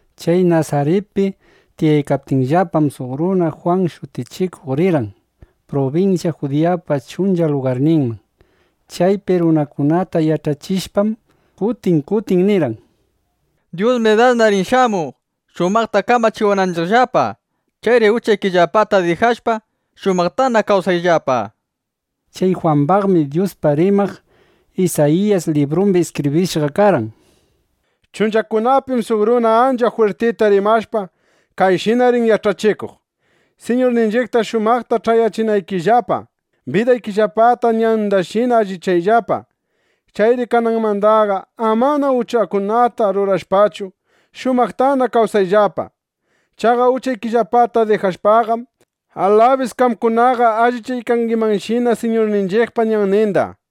(Chay Nasaritpi tiyaykaptinllapam) suq runa Jwan Shutichikuq rirqan prubinsya Judiyapa chuncha lugarninman. Chaypi runakunata yach'achishpam, kutin kutin nirqan: —Dyusmi dasna rin shamuq, shumaqta kamachiwananchiqllapa. Chayri uchaykillapata dijashpa, shumaqtana kawsayllapa, nishpa. Chay Jwambaqmi Dyuspaq rimaq Isayiyasqa librumbi iskibrishqa karqan: Chunchakunapim suq runa ancha jwirtita rimashpa, kayshina rin yach'achikuq: “Siñurninchiqta shumaqta ch'ayachinaykillapa, bidaykillapata ñandashina allichayllapa. Chayri kananmandaqa, amana uchakunata rurashpachu, shumaqtana kawsayllapa. Chaqa uchaykillapata dijashpaqam, alabis qamkunaqa allichaykangimanshina Siñurninchiqpa ñanninda”, nishpa.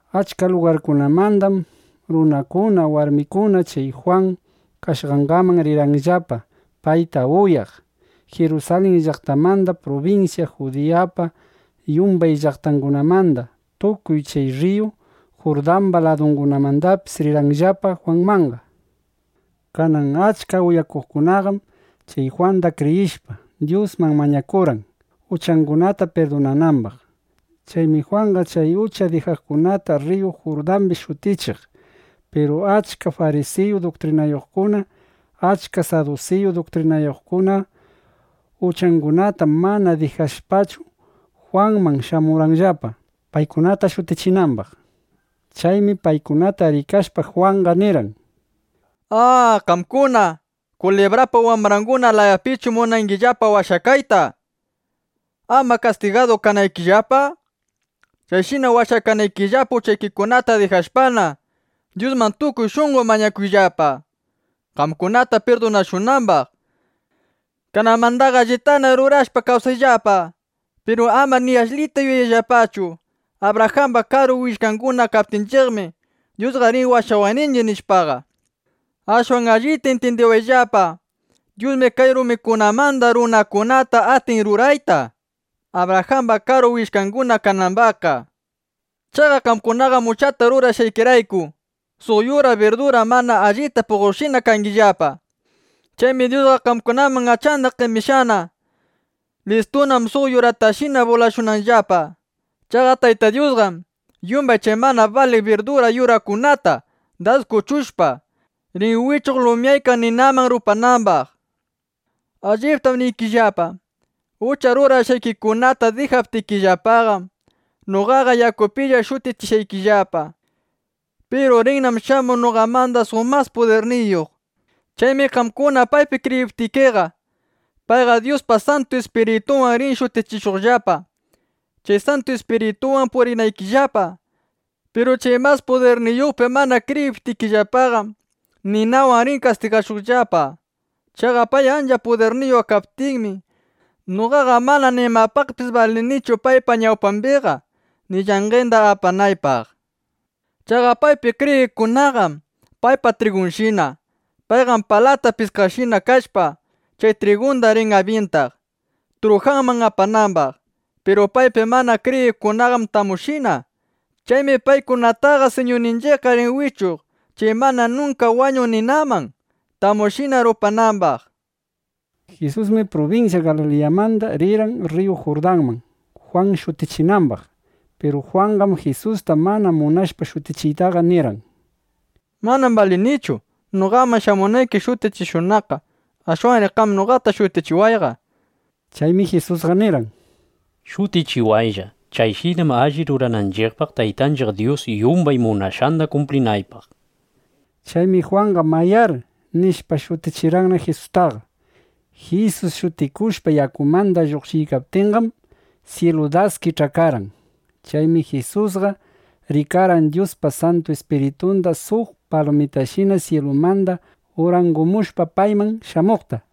Achka lugarkunamandam runakuna, warmikuna chay Jwan kashqanman rirqanllapa, payta uyaq. Jirusalin llaqtamanda, prubinsya Judiyapa yumbay llaqtangunamanda, tukuy chay rriyu Jurdamba ladungunamandapis rirqanllapa Jwanmanqa. Kanan achka uyaqkunaqam, chay Jwanda kriyishpa, Dyusman mañakurqan, uchangunata pirdunanambaq. Chaymi Jwanqa chay uchata dijaqkunata rriyu Jurdambi shutichiq. Piru achka farisiyu duktrinayuqkuna, achka sadusiyu duktrinayuqkuna (uchangunata mana dijashpachu) Jwanman shamurqanllapa, paykunata shutichinambaq. Chaymi paykunata rikashpa, Jwanqa nirqan: —¡A! ¿Qamkuna kulibrapa wambranguna layapischu munangillapa washakayta, ama kastigadu kanaykillapa? Chayshina washakanaykillapa uchaykikunata dijashpana, Dyusman tukuy shunqo mañakuyllapa, qamkunata pirdunashunambaq. Kananmandaqa allitana rurashpa kawsayllapa. Piru amar ni ashlita yuyayllapachu: Abrajamba karu willkanguna kaptinchiqmi, Dyusqa rin washawaqninchiq, nishpaqa. Ashwan allita intyindiwayllapa, Dyusmi kay rumikunamanda runakunata atin rurayta, Abrajamba karu willkanguna kanambaqqa. Chaqa qamkunaqam uchata rurashqaykirayku, suq yura birdura mana allita puqoqshina kangillapa. Chaymi Dyusqa qamkunaman achanda qemishqana. Listunam suq yuratashina bulashunanllapa. Chaqa Tayta Dyusqam yumbay chay mana baliq birdura yurakunata das kuchushpa, rin wichuq lumyaykaq ninaman rupanambaq. Alliptam niykillapa, ucha rurashqaykikunata dijaptikillapaqam, noqaqa yakupilla shutichiykillapa. Piru rinnam shamuq noqamanda suq mas pudirniyuq. Chaymi qamkuna paypi kriyiptikiqa, payqa Dyuspa Santu Ispiritunwan rin shutichishuqllapa, chay Santu Ispiritunwanna purinaykillapa. Piru chay mas pudirniyuqpi mana kriyiptikillapaqam, ninawan rin kastigashuqllapa. Chaqa pay ancha pudirniyuq kaptinmi, noqaqa mana nimapaqpis balinichu paypa ñawpambiqa, ni llanqenda apanaypaq. Chaqa paypi kriyiqkunaqam paypa trigunshina. Payqam palata piskaqshina kashpa, chay trigunda rin abyintaq, trujanman apanambaq. Piru paypi mana kriyiqkunaqam tamushina. Chaymi paykunataqa Siñurninchiqqa rin wichuq chay mana nunka wañuq ninaman, tamushina rupanambaq, nishpa. Jisusmi prubinsya Galiliyamanda rirqan rriyu Jurdanman, Jwan shutichinambaq. Piru Jwanqam Jisusta mana munashpa shutichiyta nirqan: —Manam balinichu, noqaman shamunayki shutichishunaqqa. Ashwanri qam noqata shutichiway, nishpa. Chaymi Jisusqa nirqan: —Shutichiwaylla. Chayshinam alli rurananchiqpaq, Taytanchiq Dyus yumbay munashqanda kumplinaypaq, nishpa. Chaymi Jwanqa “Mayár”, nishpa, shutichirqanna Jisustaqa. Jisus shutikushpa, yakumanda lluqshiykaptinqam, syilu das kich'akarqan. Chaymi Jisusqa rikarqan Dyuspa Santu Ispiritunda suq palumashina syilumanda urangumushpa payman shamuqta.